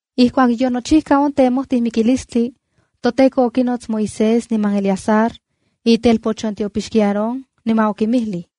Ijkuak yonochijka on temojti mikilistli, toTEKO okinots Moisés niman Eleazar itelpoch on tiopixki Aarón, niman okinmijlij: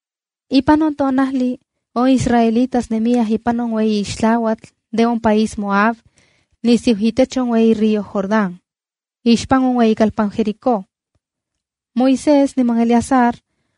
Ipan on tonajli on israelitas nemiyaj ipan on ueyi ixtlauatl de on país Moab nisiu itech on ueyi río Jordán ixpan on ueyikalpan Jericó. Moisés niman Eleazar,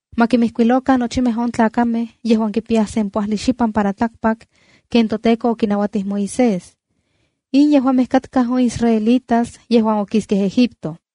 ma kimijkuilokan nochimej on tlakamej yejuan ye kipiyaj sempoajli xipan para tlakpak ken toTEKO okinauatij Moisés. In yejuamej katkaj on israelitas yejuan okiskej Egipto.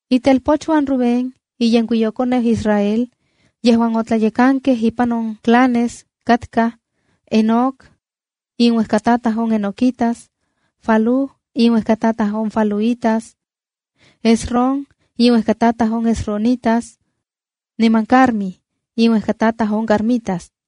Itelpochuan Rubén, iyenkuiyokoneu Israel yejuan otlayekankej ipan on clanes, katkaj: Enoc inuejkataj on Enoquitas, Falú inuejkataj on Faluitas, Hezron inuejkataj on hezronitas, niman Carmi inuejkataj on carmitas.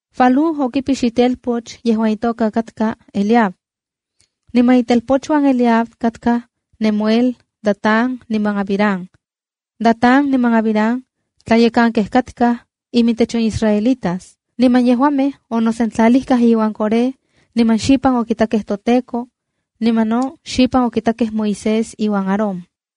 Falú okipix itelpoch yejuan itoka katka Eliab. Niman itelpochuan Eliab katkaj Nemuel, Datán niman Abiram. Datán niman Abiram tlayekankej katkaj imintech on israelitas. Niman yejuamej onosentlalijkaj iuan Coré niman xipan okitakej toTEKO, niman no xipan okitakej Moisés iuan Aarón.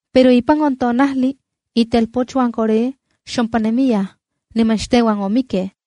Pero ipan on tonajli, itelpochuan Coré xompa nemiyaj niman xteuan omikkej.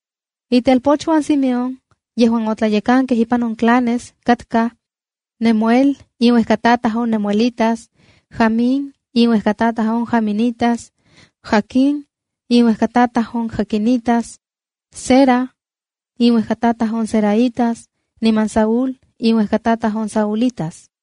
Itelpochuan Simeón yejuan otlayekankej ipan on clanes katkaj: Nemuel, inuejkatataj on nemuelitas; Jamín, inuejkatataj on jaminitas; Jaquín, inuejkatataj on jaquinitas; Zera, inuejkataj on zeraitas, niman Saúl, inuejkatataj on saulitas.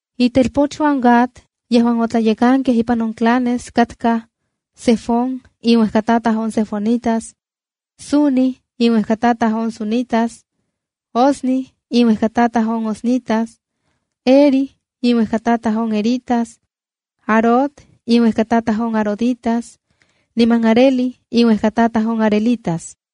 Itelpochuan Gad yejuan otlayekankej ipan on clanes katkaj: Zefón, inuejkatataj on zefonitas; Hagui, inuejkatataj on haguitas; Suni, inuejkatataj on sunitas; Ozni, inuejkatataj on oznitas; Eri, inuejkatataj on eritas; Arod, inuejkatataj on aroditas; niman Areli, inuejkataj on arelitas.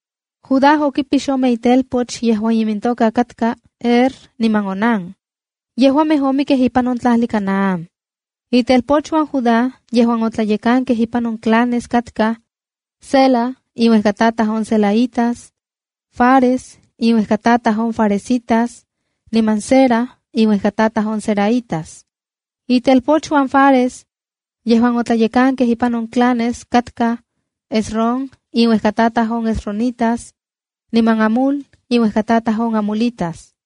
Judá okipix ome itelpoch yejuan imintoka katka Er niman Onán. Yejuamej omikkej ipan on tlajli de Canaán. Itelpochuan Judá yejuan otlayekankej ipan on clanes katkaj: Sela, inuejkatataj on selaitas; Fares, inuejkatataj on faresitas; niman Zera, inuejkatataj on zeraitas. Itelpochuan Fares yejuan otlayekankej ipan on clanes katkaj: Hezrón inuejkatataj on hezronitas, niman Hamul inuejkatataj on hamulitas.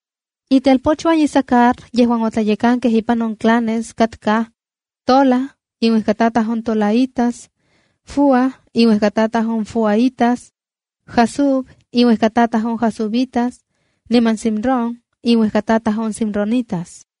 Itelpochuan Isacar yejuan otlayekankej ipan on clanes katkaj: Tola, inuejkatataj on tolaitas; Fúa, inuejkatataj on fuaítas; Jasub, inuejkatataj on jasubitas; niman Simrón, inuejkatataj on simronitas.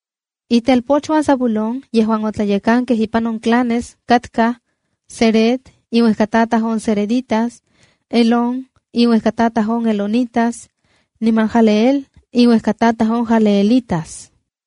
Itelpochuan Zabulón yejuan otlayekankej ipan on clanes katkaj: Sered, inuejkatataj on sereditas; Elón, inuejkatataj on elonitas; niman Jahleel, inuejkataj on jahleelitas.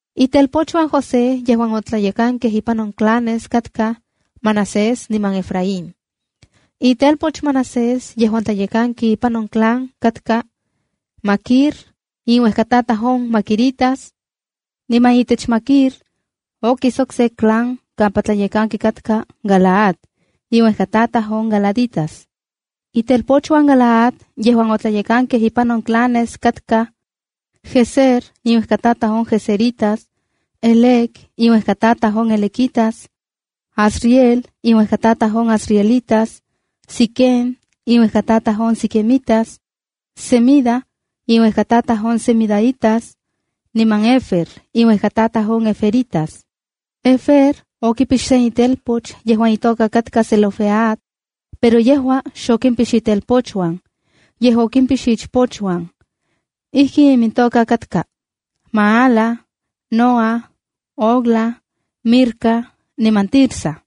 Itelpochuan José yejuan otlayekankej ipan on clanes katkaj: Manasés niman Efraín. Itelpoch Manasés yejuan tlayekanki ipan on clan katka: Maquir, inuejkatataj on maquiritas. Niman itech Maquir okis okse clan kampa tlayekanki katka Galaad, inuejkataj on galaditas. Itelpochuan Galaad yejuan otlayekankej ipan on clanes katkaj: Jezer, inuejkatataj on jezeritas; Helec, inuejkatataj on helequitas; Asriel, inuejkatataj on asrielitas; Siquem, inuejkatataj on siquemitas; Semida, inuejkatataj on semidaitas; niman Hefer, inuejkatataj on heferitas. Hefer okipix se itelpoch yejuan itoka katka Zelofead, pero yejua xokimpix itelpochuan, yej okimpix ichpochuan. Ijkin imintoka katka: Maala, Noa, Hogla, Milca niman Tirsa.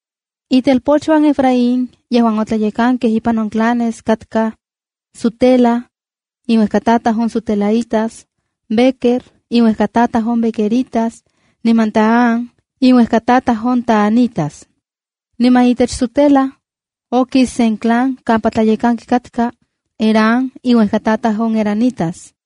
Itelpochuan Efraín yejuan otlayekankej ipan on clanes katkaj: Sutela, inuejkatataj on sutelaitas; Bequer, inuejkatataj on bequeritas; niman Tahán, inuejkatataj on tahanitas. Niman itech Sutela, okis sen clan kampa tlayekanki katka: Erán, inuejkatataj on eranitas.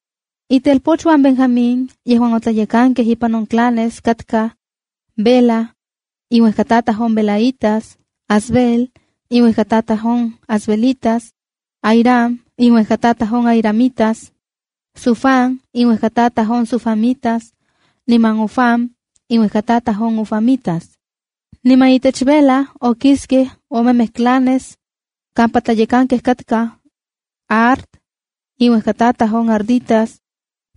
Itelpochuan Benjamín yejuan otlayekankej ipan on clanes katkaj: Bela, inuejkatataj on belaítas; Asbel, inuejkatataj on asbelitas; Ahiram, inuejkatataj on ahiramitas; Sufam, inuejkatataj on sufamitas niman Hufam, inuejkatataj on hufamitas. Niman itech Bela okiskej omemej clanes kampa tlayekankej katkaj: Ard, inuejkatataj on arditas;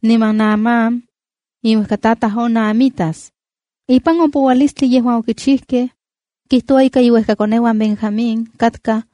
niman Naamán, inuejkatataj on naamitas. Ipan on poualistli yejuan okichijkej, kijtoua ika iuejkakoneuan Benjamín, katkaj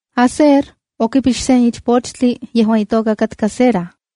Aser okipix sen ichpochtli yejuan itoka katka Sera.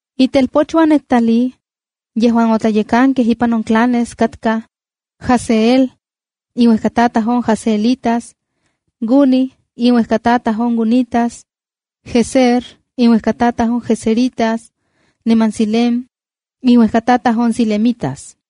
Itelpochuan Neftalí yejuan otlayekankej ipan on clanes katkaj: Jahzeel, inuejkatataj on jahzeelitas; Guni, inuejkatataj on gunitas; Jezer, inuejkatataj on jezeritas; niman Silem inuejkatataj on silemitas.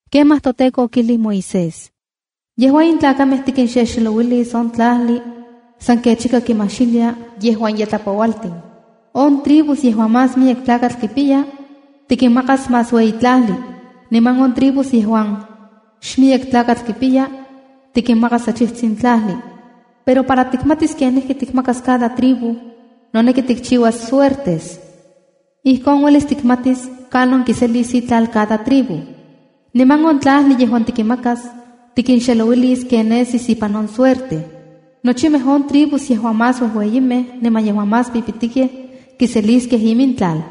Kemaj toTEKO okijlij Moisés: “Yejua in tlakamej tikinxelouilis on tlajli san kech ika kimaxilia yejuan ye tlapoualtin. On tribus yejuan más miyek tlakatl kimpiya, tikinmakas más ueyi tlajli. Niman on tribus yejuan xmiyek tlakatl kipiya, tikinmakas achijtsin tlajli. Pero para tikmatis kenijki tikmakas cada tribu, noneki tikchiuas suertes. Ijkon uelis tikmatis kanon kiselis itlal cada tribu. Niman on tlajli yejuan tikinmakas, tikinxelouilis ken nesis ipan on suerte. Nochimej on tribus yejuan más uejueyimej niman yejuan más pipitikej kiseliskej imintlal.”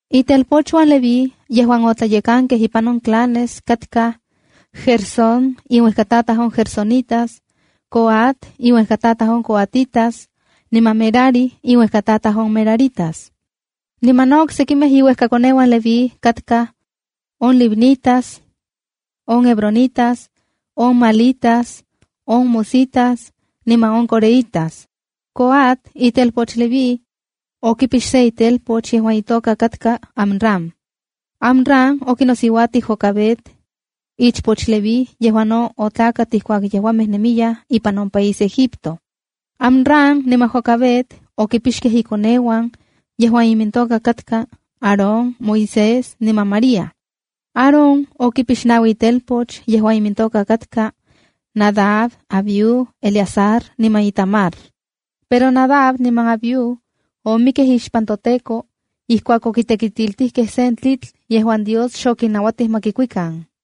Itelpochuan Leví yejuan otlayekankej ipan on clanes katkaj: Gersón, inuejkatataj on gersonitas; Coat, inuejkatataj on coatitas; niman Merari, inuejkatataj on meraritas. Niman no oksejkimej iuejkakoneuan Leví katkaj: on libnitas, on hebronitas, on mahlitas, on musitas, niman on coreítas. Coat itelpoch Leví, okipix se itelpoch yejuan itoka katka Amram. Amram okinosiuatij Jocabed, ichpoch Leví yejuan no otlakat ijkuak yejuamej nemiyaj ipan on país Egipto. Amram niman Jocabed okimpixkej inkoneuan yejuan imintoka katka Aarón, Moisés niman María. Aarón okipix naui itelpoch yejuan imintoka katka Nadab, Abiú, Eleazar niman Itamar. Pero Nadab niman Abiú omikkej ixpan toTEKO ijkuak okitekitiltijkej sen tlitl yejuan Dios xokinnauatij ma kikuikan.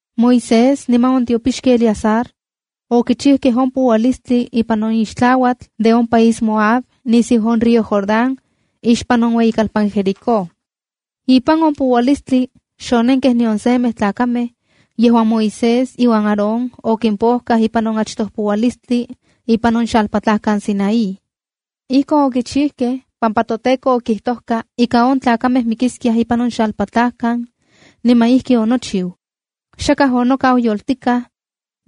Moisés niman on tiopixki Eleazar okichikej on poualistli ipan on ixtlauatl de on país Moab nisiu on río Jordán ixpan on ueyikalpan Jericó. Ipan on poualistli xonenkej nion semej tlakamej yejuan Moisés iuan Aarón okimpojkaj ipan on achtoj poualistli ipan on xalpatlajkan Sinaí. Ijkon okichikej pampa toTEKO okijtojka ika on tlakamej mikiskiaj ipan on xalpatlajkan niman ijki onochiu. Xakaj onokau yoltikaj,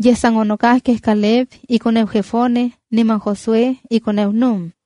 yej san onokajkej Caleb, ikoneu Jefone, niman Josué, ikoneu Nun.